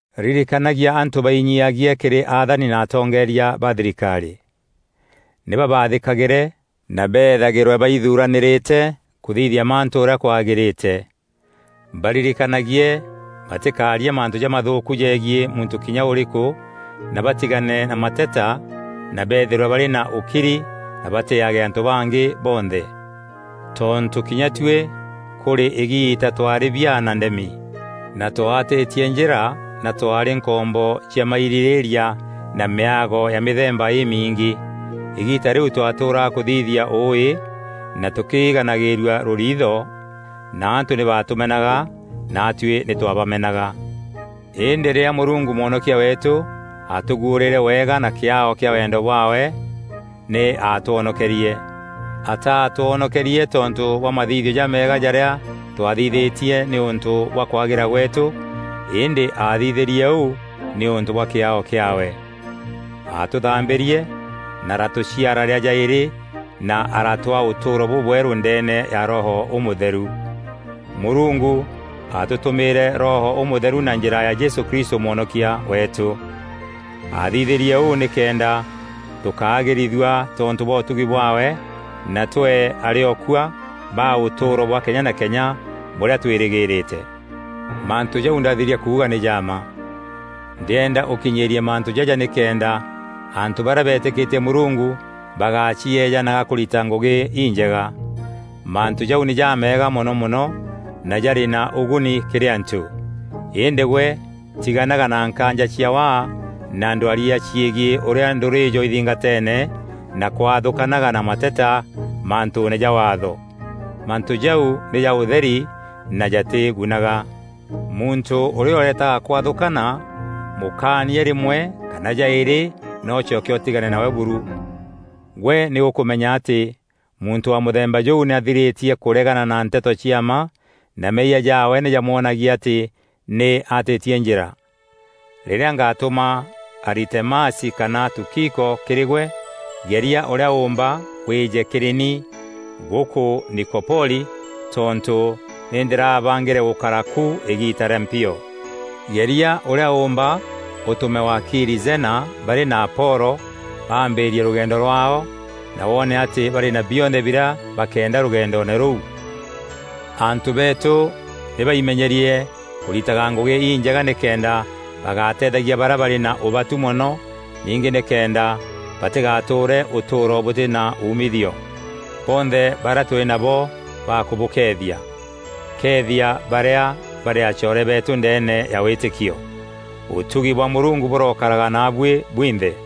Ririkanagia antû bainyiiagie kîrî athani na atongeeria ba thirikarî. Nî babathîkagîre na beethagîrwe baithuranîrîte kûthithia mantû ûrîa kwagîrîte. Baririkanagie batîkaarie mantû jamathûûku jegiî muntû kinya ûrîkû na batigane na mateta na beethîrwe barî na ûkiri na batîîage antû bangî bonthe. Tontû kinya tuî kûrî îgiita twaarî biaa na ndemi na twaatîtie njîra na twaarî nkombo cia mairîrîîria na mîago ya mîthemba îmiingî. Îgiita rîu twaatûraga kûthithia ûûî na tûkiganagîrua rûriitho na antû nî baatûmenaga naatuî nî twaabamenaga. Îndî rîrîa Mûrungu Mwonokia weetû aatûguûrîîre wega na kîaao kîa wendo bwaawe nî aatwonokerie. Ataatwonokerie tontû bwa mathithio jameega jarîa twaathithîtie nîûntû bwa kwagîra gweetû îndî aathithîrie ûu nîûntû bwa kîaao kîaawe. Aatûthambîrie na araatûciara rîa jaîrî na araatûaa ûtûûro bûbwerû ndeene ya Roho Ûmûtheru. Mûrungu aatûtûmîîre Roho Ûmûtheru na njîra ya Jesû Kristû Mwonokia weetû. Aathithîrie ûu nîkenda tûkaagîrithua tontû bwa ûtugi bwaawe na twee arîokua ba ûtûûro bwa kenya na kenya bûrîa twîrîgîrîte. Mantû jau ndathiria kuuga nî ja mma. Ndîenda ûkinyîîrie mantû jaja nîkenda antû barîa beetîkîtie Mûrungu bagacieejanaga kûrita ngûgî injega. Mantû jau nî jameega mono mono na jarî na ûguni kîrî antû. Îndî gwe tiganaga na nkaanja cia waa na ndwaria ciegiî ûrîa ndûrîîjo ithingateene na kwathûkanaga, na mateta mantûûne ja Waatho. Mantû jau nî ja ûtheri na jatîgunaga. Muntû ûrîa ûretaga kwathûkana, mûkaanie rîmwe kana jaîrî na ûcoke ûtigane nawe buru. Gwe nî ûkûmenya atî muntû wa mûthemba jûu nî athirîtie kûregana na nteto cia mma na meeyia jaawe nî jamwonagia atî nî aatîtie njîra. Rîrîa ngatûma Aritemasi kana Tukiko kîrî gwe, geria ûrîa ûûmba wîîje kîrî ni gûkû Nikopoli tontû nî ndîrabangîre gûkara ku îgiita rîa mpio. Geria ûrîa ûûmba ûtûme wakiiri Zena barî na Apolo baambîîrie rûgendo rwaao, na woone atî barî na bionthe birîa bakeenda rûgendoone rûu. Antû beetû nî baimenyerie kûritaga ngûgî injega nîkenda bagateethagia barîa barî na ûbatu mono ningî nîkenda batîgatûûre ûtûûro bûtî na umithio. Bonthe barîa tûrî nabo bakûbûkeethia. Keethia barîa barî acoore beetû ndeene ya wîtîkio. Ûtugi bwa Mûrungu bûrokaraga naabuî bwinthe.